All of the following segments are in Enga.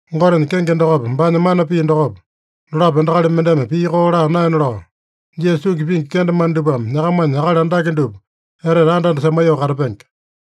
Gotenya kenge dokopa, baanya mana pii dokopa, dolapo endakali mendeme pii koo laa naena lao, Jisasa tungi pingi kendemane dupame nyakamanya akali andake dupa etete anda-anda semaiyoo katapenge.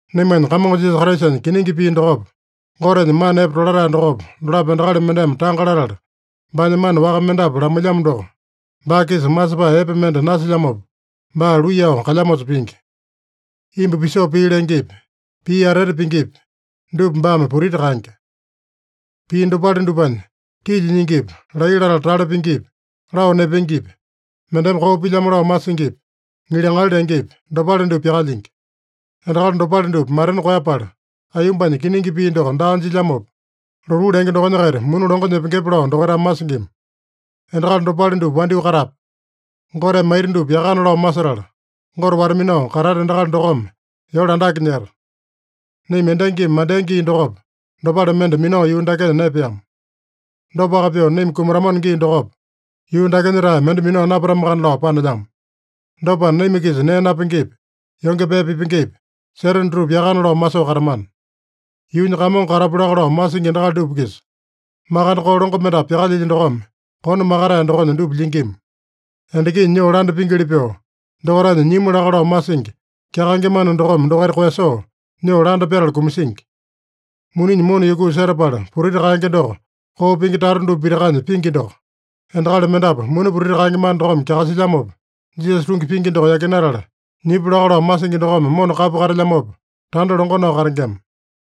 Naimanya Kamongo Jisasa Kraisanya kiningi pii dokopa, Gotenya mana epe tolatae dokopa, dolapo endakali mendeme tanga latala, baanya mana waka mendapu lamailyamo doko, baa-kisa masepae epe mende nasilyamopa, baa luiyao kalyamosa pingi. Imbu pisoo pii lengepi, pii atete pingipi, dupa baame putiti kaenge. Pii dopale dupanya, tilya nyingipi, laiya latala tale pingipi, lao nepengepi, mendeme koo pilyamo lao masingipi, ŋiliŋali lengepi, dopale dupa pyakalyingi. Endakali dopale dupa matena koeyapala, aiyombanya kiningi pii doko daa jilyamopa, lotuu lenge dokonya-kaita muni longo nyepengepe lao dokaitame masingima. Endakali dopale dupa wandyoo katape. Goteme maita dupa yakana lao masetala, Gote wata-minao katata endakali dokome yole andake nyeta. Naima endangimi mandea gii dokopa, dopale mende minao yuu dakenya naepeama. Dopaka pyoo naima kumatamano gii dokopa, yuu dakenya-tae mende minao napatamakana lao panelyamo. Dopana, naima-kisa nee napengepi, yonge pee pipengepi, seta dutupa yakana lao masoo katamana. Yuunya kamongo katapu laka lao masingi endakali dupa-kisa, makande koo longo mendapu pyakalyilya dokome, kone makatae dokonya dupa lyingima. Endakinya nyoo landa pingili pyoo, dokaitanya nyimu laka lao masingi, kyakaenge mana dokome dokaita koeyasoo, nyoo landa pyatala kumasingi. Muninya mona yukuu setapala putiti kaenge doko, koo pingi tata dupa pitakanya pingi doko. Endakali mendapu muni putiti kaenge mana dokome kyakasilyamopa, Jisasa tungi pingi doko yakinatala, nyipu laka lao masingi dokome mona kapu katelyamopa, tanda longo nao katengema.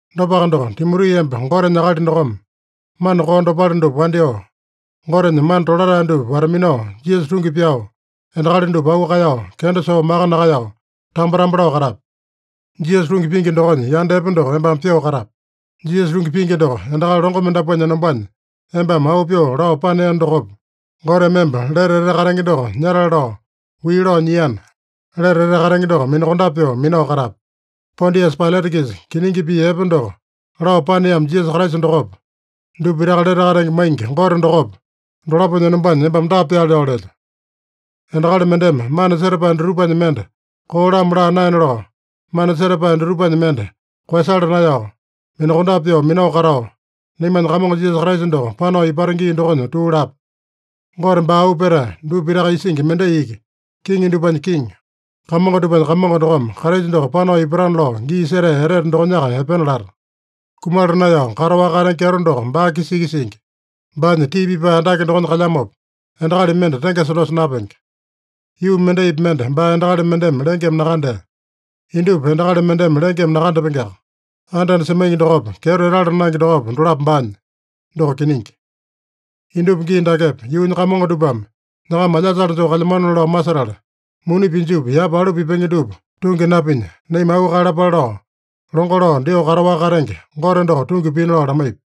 Dopaka doko, Timoti, emba Gotenya akali dokome, mana koo dopale dupa wandyoo, Gotenya mana tolatae dupa wata-minao, Jisasa tungi pyao, endakali dupa auu kaeyao, kenda soo maka nakaeyao, tambo-tambo lao katape. Jisasa tungi pingi dokonya yanda epe doko embame pyoo katape. Jisasa tungi pingi doko endakali longo mendapuanya enombanya embame auu pyoo lao paneeno dokopa, Goteme emba lete etete katenge doko nyatale lao wii lao nyiana, lete etete katenge doko minakondape pyoo minao katape. Pondiasa Pailata-kisa kiningi pii epe doko lao paneamo Jisasa Kraisa dokopa, dupa pitaka lete katenge maingi Gote dokopa, dolaponya enombanya embame dapa pyaale lao lelyo: Endakali mendeme mana setapae dutupanya mende koo-lamo laa naena lao, mana setapae dutupanya mende koeyasala naeyao, minakondape pyoo minao katao, naimanya Kamongo Jisasa Kraisa doko panao ipata gii dokonya tuu lape. Gote baa auu petae, dupa pitaka isingi mendai iki, kiŋi dupanya Kiŋi, kamongo dupanya Kamongo dokome Kraisa doko panao ipatana lao gii setea etete dokonyaka epena lata. Kumala naeyao kataowaka katenge kyeto doko baa-kisa iki singi. Baanya tii pipae andake dokonya kalyamopa, endakali mende tengesa dosa napenge. Yuu mendaipi mende baa endakali mendeme lengeme nakandea. Indupa endakali mendeme lengeme nakandapengeaka. Anda-anda semaingi dokopa, kyeto etala naenge dokopa, dolapo baanya. Doko kiningi. Indupa gii dakepa, yuunya kamongo dupame nyakama alyasale joo kalyamanona lao masetala, muni pinjupi yapa alu pipenge dupa tungi napinya, naima auu kaeyalapale lao longo lao dyoo kataowaka katenge Gote doko tungi pina lao lamaipi.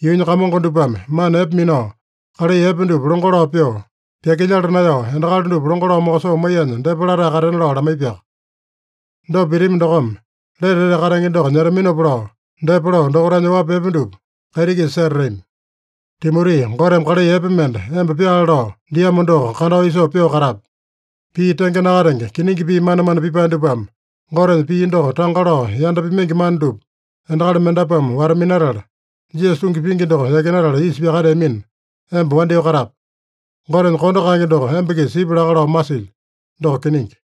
Yuunya kamongo dupame mana epe minao, kalai epe dupa longo lao pyoo, pyakilyala naeyao endakali dupa longo lao mokosoo maiyanya depa latae katena lao lamaipiaka. Dopa pitami dokome, lete etete katenge doko nyetaminopa lao, depa lao dokaitanya oapi epe dupa kaiti-kisa setatami. Timoti, Goteme kalai epe mende emba pyaale lao diamo doko kandao isoo pyoo katape. Pii tenge nakatenge, kiningi pii manemane pipae dupame, Gotenya pii doko tanga lao yanda pimaingi mana dupa, endakali mendapuame wata-minatala, Jisasa tungi pingi doko yakinatala isa pyakateamina, emba wandyoo katape. Gotenya kondo kaenge doko emba-kisa sipya laka lao masilyo. Doko kiningi.